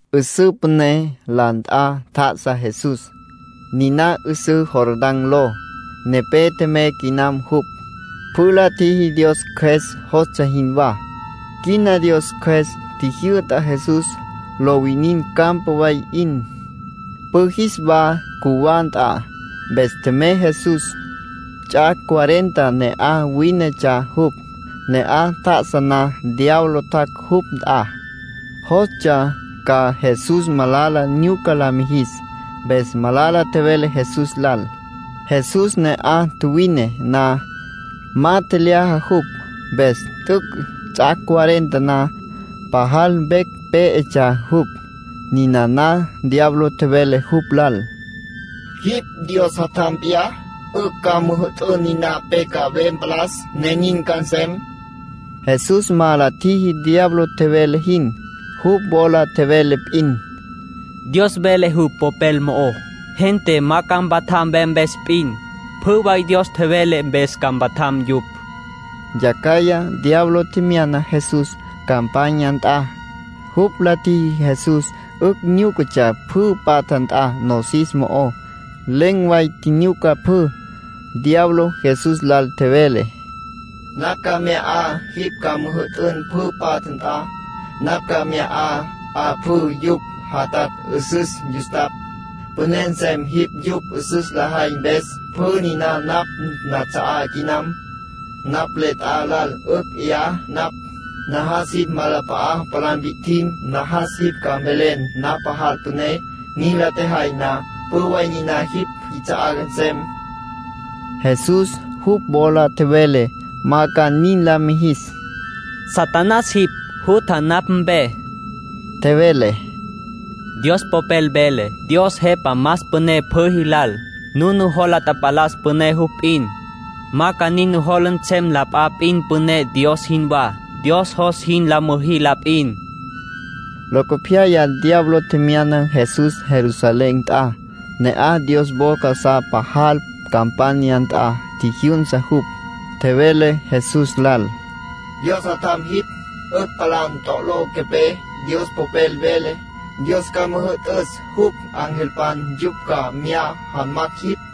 'Üsǘ püné la nt'a tjá'asa Jesús. Niná 'üsǘ Jordán ló. Nepé tjemey quinam jupj. Pjü la tjiji Dios Cjües jostsja jinwá. Quina Dios Cjües tjijyü'ta Jesús lo winin campa way 'in, pjü jis wa cjuwá nt'a. Mpes tjemey Jesús. Ts'ac' cuarenta ne'aj wínetsja jupj. Ne'aj tjá'asa na diablo tjac' jupj nt'a. Jostsja ca Jesús malala nyuca la mijis, mpes malala tjevele Jesús lal. Jesús ne'aj tjuwine na, ma tjelyaja jupj. Mpes t'üc' ts'ac' cuarenta na, pajal vecj pé'etsja jupj. Ninana diablo tjevele jupj lal: —Jipj Dios Jatjam p'iyá, 'ücj ca müjü'tün niná pe ca ve mpalas, ne nin ca nsem. Jesús ma la tjiji diablo tjevele jin. Jupj wola tjevele p'in: —Dios vele jupj Popel mo'ó: ‘Gente ma ca mpatjam ve mpes p'in. Pjü way Dios tjevele mpes ca mpatjam yupj.’ Yacjaya diablo tjemyana Jesús campanya nt'a. Jupj la tjiji Jesús 'ücj nyúcatsja pjü patja nt'a nosis mo'ó. Len̈ way tjinyuca pjü. Diablo Jesús lal tjevele: —Napj ca mya 'a jipj ca müjü'tün pjü patja nt'a. Napj ca mya 'a pjü yupj jatatj 'üsüs yustapj. Püné nsem jipj yupj 'üsüs lajay mpes. Pjü niná napj nats'a'á quinam. Napj le t'a lal 'ücj 'ya napj. Najas jipj nawalap'a'a palá mpi'tjim. Najas jipj ca mvelen napj pajal püné. Nin la tjejay na, pjü way niná jipj jits'a'á nsem. Jesús jupj wola tjevele ma ca nin la mijis. —Satanás jipj, jutja napj mpe —tjevele—. Dios Popel vele: ‘Dios Jepa más püné pjü jis lal. Nujola tapalas püné jupj p'in. Ma ca nin nujola nsem la p'a p'in püné Dios jinwá. Dios jos jin la müjí la p'in.’ Locopyaya diablo tjemyana Jesús Jerusalén nt'a. Ne'aj Dios wo casá pajal campanya nt'a tjijyünsa jupj. Tjevele Jesús lal: —Dios Jatjam jipj, 'ücj palá ntolo quepé. Dios Popel vele: ‘Dios ca müjü'tüs jupj angelpan yupj ca mya jamacj jipj.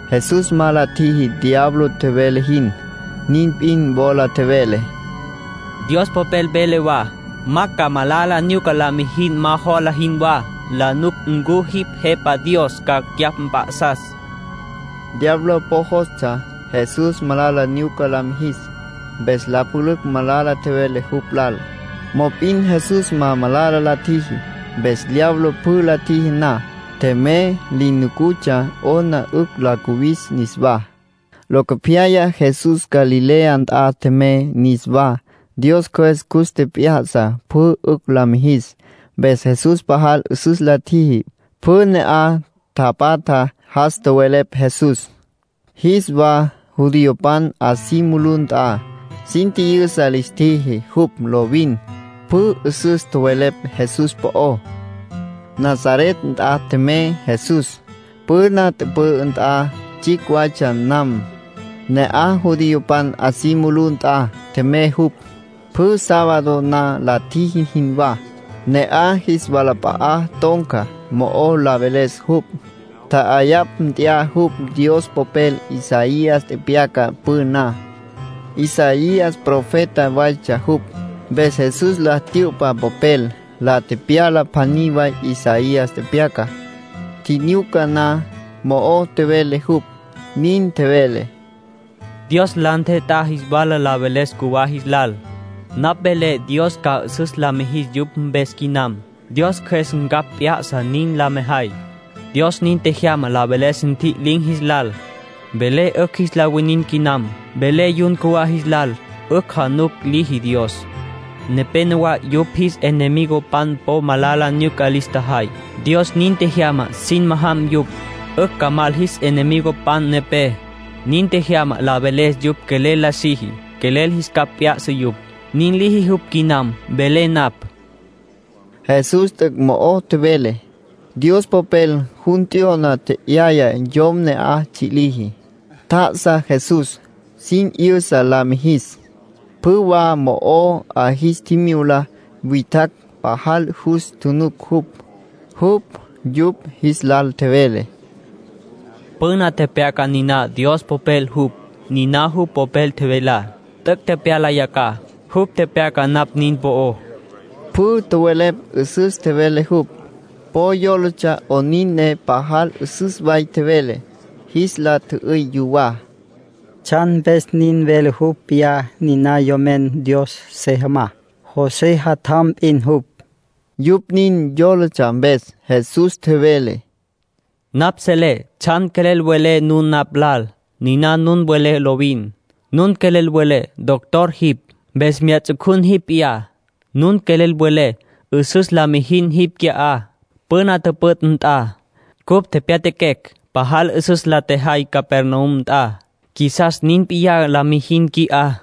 Jesús ma la tjiji diablo tjevele jin. Nin p'in wola tjevele: —Dios Popel vele wa: ‘Ma ca malala nyuca la mijin ma jola jinwá, la nuc ncu jipj Jepa Dios ca cyapj mp'a'sas’. Diablo po jostsja Jesús malala nyuca la mijis, mpes la pülücj malala tjevele jupj lal. Mop'in Jesús ma malala la tjiji. Mpes diablo pjü la tjiji na, tjemey, li nucutsja 'ona 'ücj la cuwis niswá. Locopyaya Jesús Galilea nt'a tjemey niswá. Dios Cjües cus tjep'ya'sa pjü 'ücj la mijis. Mpes Jesús pajal 'üsüs la tjiji. Pjü ne'aj tapatjá jas tjowelepj Jesús. Jis wa judiopan 'a si mulú nt'a, sin tji'yüsa lis tjiji jupj lovin. Pjü 'üsüs tjowelepj Jesús po'ó. Nazaret nt'a tjemey Jesús, püna tüpü'ü nt'a tsjicj waytsja nam. Ne'aj judiopan 'a si mulú nt'a tjemey jupj, pjü sábado na la tjiji jinwá. Ne'aj jis walap'a'a ton̈ca, mo'o la veles jupj. Tja'ayapj nt'ya jupj Dios Popel Isaías tepyaca püná. Isaías profeta waytsja jupj. Mpes Jesús la tyü'pa popel, la tepyala pjaní way Isaías tepyacá. Tjinyuca na, mo'o tjevele jupj. Nin tjevele: “Dios la ntjet'á jis wala la veles cjuwá jis lal. Napj velé Dios ca 'üsüs la mijis yupj mpes quinam. Dios Cjües ncapj p'ya'sa nin la mejay. Dios nin tjejyama la veles ntji'lin̈ jis lal. Velé 'ücj jis la winin quinam. Velé yun cjuwá jis lal, 'ücj januc liji Dios. Nepénowa yupj jis enemigopan po malala nyuca lis tjajay. Dios nin tjejyama sin majam yupj, 'ücj ca mal jis enemigopan nepé. Nin tjejyama la veles jupj quelel la siji, quelel jis capj p'ya'sa yupj. Nin liji jupj quinam, velé napj.” Jesús t'üc' mo'o tjevele. Dios Popel jun t'yo'na, tje'yaya yom ne'aj tsji' liji. Tjá'asa Jesús, sin 'yüsa la mijis. Pjü wa mo'ó 'a jis tjimyula witjacj pajal jus tjunuc jupj. Jupj yupj jis lal tjevele: “Püna tepyaca niná Dios Popel jupj. Niná jupj Popel tjevelá, t'üc' tepyala yacjaj. Jupj tepyaca napj nin po'ó”, tjevele Jesús. Pjü tjowelepj 'üsüs tjevele jupj. Po yólatsja 'onin ne pajal 'üsüs way tjevele. Jis la tjü'üy yuwá: “¿Tsjan mpes nin vele jupj p'iyá niná Yomen Dios se jamá? José jatjam p'in jupj.” Yupj nin yólatsja mpes, Jesús tjevele: “Napj selé tsjan quelel welé nun napj lal. Niná nun welé lovin. Nun quelel welé: ‘Doctor jipj, mpes mya ts'ucun jipj p'iyá’. Nun quelel welé: ‘'Üsüs la mijin jipj qui'á, püna tüpüt' nt'a. Cupj tjepjya'aquecj pajal 'üsüs la tjejay Capernaum nt'a. Qjuisas nin p'iyá la mijin qui'á.’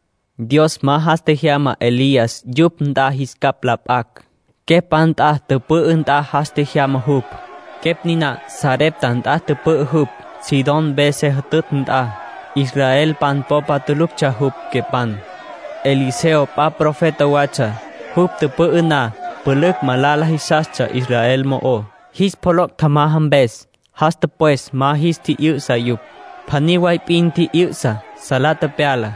Dios ma jas tjejyama Elías yupj nt'a jis capj la p'acj. Quepj p'a nt'a tüpü'ü nt'a jas tjejyama jupj. Quepj niná Sarepta nt'a tüpü'ü jupj, Sidón mpe se jütütj nt'a. Israelpan popa tuluctsja jupj, quepan. ”Eliseo p'a profeta watsja. Jupj tüpü'ü na, pülücj malala jisastsja Israel mo'ó, jis pjoloc' tjamaja mpes. Jas tüpwes ma jis tji'yü'sa yupj. Pjaní way p'in tji'yü'sa, salá tepyala.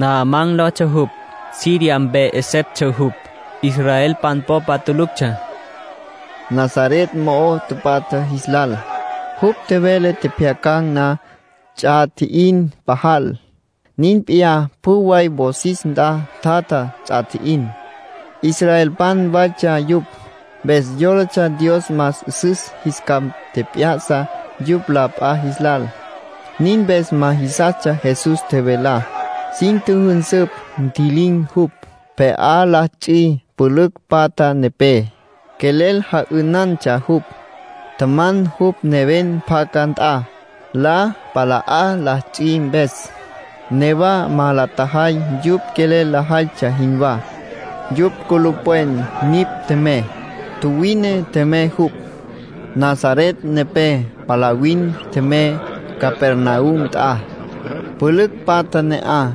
Naamán lotsja jupj. Siria mpe 'eseptsja jupj, israelpan popa tuluctsja”, nin tjevele Jesús, Nazaret mo'o tapatja jis lal. Jupj tjevele tjepjyacan̈ na ts'a tji'in pajal. Nin p'iyá pjü way wosis nt'a tjatja ts'a tji'in. (Israelpan waytsja yupj, mpes yólatsja Dios más 'üsüs jis capj tjep'ya'sa yupj la p'a jis lal. Nin mpes ma jisastsja Jesús tjevelá.) Sin tjüjünsüpj, ntji'lin̈ jupj, pje'á la ts'i pülücj patja nepé. Quelel ja'ünantsja jupj. Tjaman jupj neven pacá nt'a, la pala'á la ts'i mpes. Newa ma la tjajay yupj quelel lajaytsja jinwá. Yupj culupwen nipj tjemey, tjuwine tjemey jupj. Nazaret nepé palavin tjemey Capernaum nt'a. Pülücj patja ne'aj.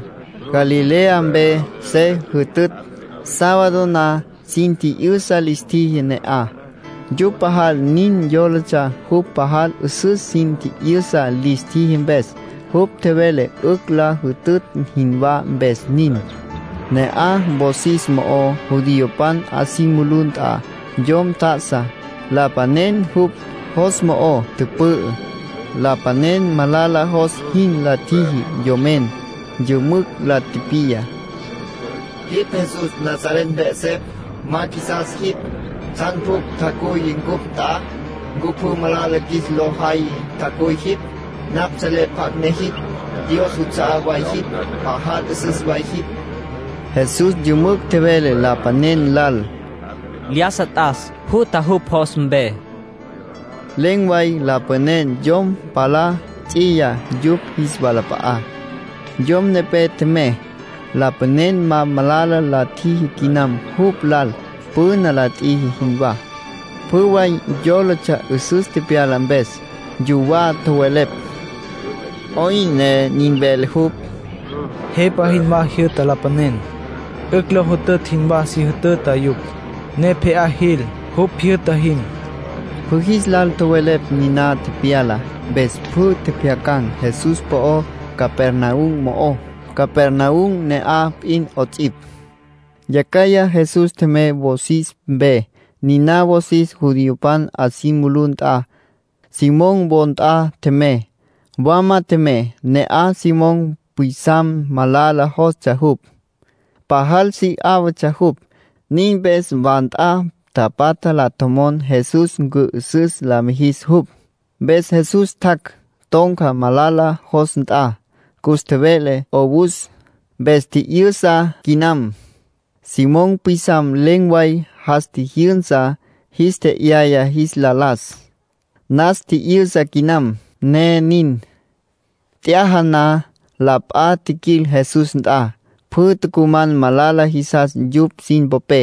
Galilea mpe se jütütj. Sábado na sin tji'yüsa lis tjiji ne'aj. Yupj pajal nin yólatsja jupj pajal 'üsüs sin tji'yüsa lis tjiji mpes. Jupj tjevele 'ücj lo jütütj jinwá, mpes nin. Ne'aj, wosis mo'ó, judiopan 'a si mulú nt'a, yom tjá'asa, lapanen jupj jos mo'o tüpü'ü. Lapanen malala jos jin la tjiji yomen. Yümücj la tipiya: —Jipj Jesús Nazaret mpe 'esepj. ¡Ma qjuisas jipj! ¿Tsjan pjucj tjacuy cupj nt'a? ¿Ncu pjü malala qjuis lo jay tjacuy jipj? Napj selé pjacj ne jipj. Dios juts'a'á way jipj. Pajal 'üsüs way jipj. Jesús yümücj tjevele lapanen lal: —¡Lyájasa t'as! ¡Jutja jupj jos mpe! —tjevele. Len̈ way lapanen yom palá ts'iya yupj jis walap'a'á. Yom nepé tjemey. Lapanen ma malala la tjiji quinam jupj lal, püna la tjiji jinwá. Pjü way yólatsja 'üsüs tepyala mpes. Yuwá tjowelepj: “¿'Oyn ne nin vele jupj? Jepa jinwá jyü'ta lapanen. 'Ücj lo jütütj jinwá si jütüta yupj, ne pje'á jil, jupj jyü'ta jin.” Pjü jis lal tjowelepj niná tepyalá, mpes pjü tjepjyacan̈ Jesús po'ó Capernaum mo'ó, Capernaum ne'aj p'in 'ots'ipj. Yacjaya Jesús tjemey wosis mpe, niná wosis judiopan 'a si mulú nt'a. Simón wo nt'a tjemey. Wama tjemey. Ne'aj Simón pwisam malala jostsja jupj, pajal si 'áwatsja jupj. Nin mpes wa nt'a tapatja la tjomon Jesús cü'ü'süs la mijis jupj. Mpes Jesús tjac', ton̈ca malala jos nt'a. Cus tjeve'le 'owus, mpes tji'yü'sa quinam. Simón pwisam len̈ way jas tjijyünsa, jis tje'yaya jis la las. Nas tji'yü'sa quinam, ne nin. T'yaja na, la p'a tjiquil Jesús nt'a. Pjü tucuman malala jisas yupj sin popé.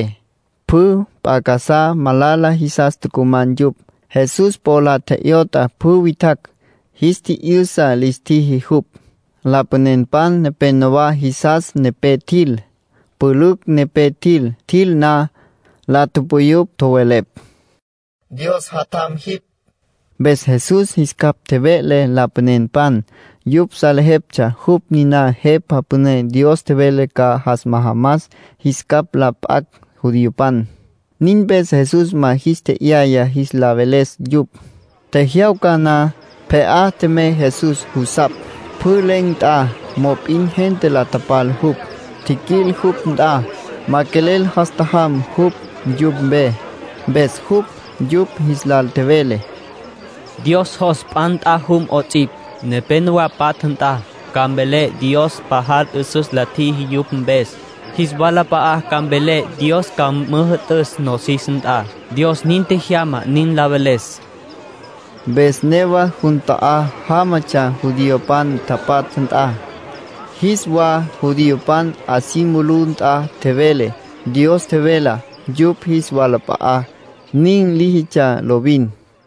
Pjü p'a casá malala jisas tucuman yupj. Jesús po la tje'yot'a pjü witjacj, jis tji'yü'sa lis tjiji jupj. Lapanenpan nepénowa jisas nepé tjil, pülücj nepé tjil. Tjil na, la tupuyupj, tjowelepj: “¡Dios Jatjam jipj!” Mpes Jesús jis capj tjeve'le lapanenpan. Yupj salejeptsja jupj niná Jepa Püné Dios tjevele ca jas majamas jis capj la p'acj judiopan. Nin mpes Jesús ma jis tje'yaya jis la veles yupj. Tjejyawca na, pje'á tjemey Jesús jusapj, pjü len̈ nt'a. Mop'in gente la tapal jupj. Tjiquil jupj nt'a. Ma quelel jas tjajam jupj yupj mpe. Mpes jupj yupj jis lal tjevele: “Dios jos p'a nt'a jum 'ots'ipj, nepénowa patja nt'a. Ca mvelé Dios pajal 'üsüs la tjiji yupj mpes. Jis walap'a'a ca mvelé Dios ca müjü'tüs nosis nt'a. Dios nin tjejyama nin la veles.” Mpes newa jun ta'á jámatsja judiopan tapatja nt'a. Jis wa judiopan 'a si mulú nt'a tjevele Dios tjevelá yupj jis walap'a'á. Nin líjitsja lovin.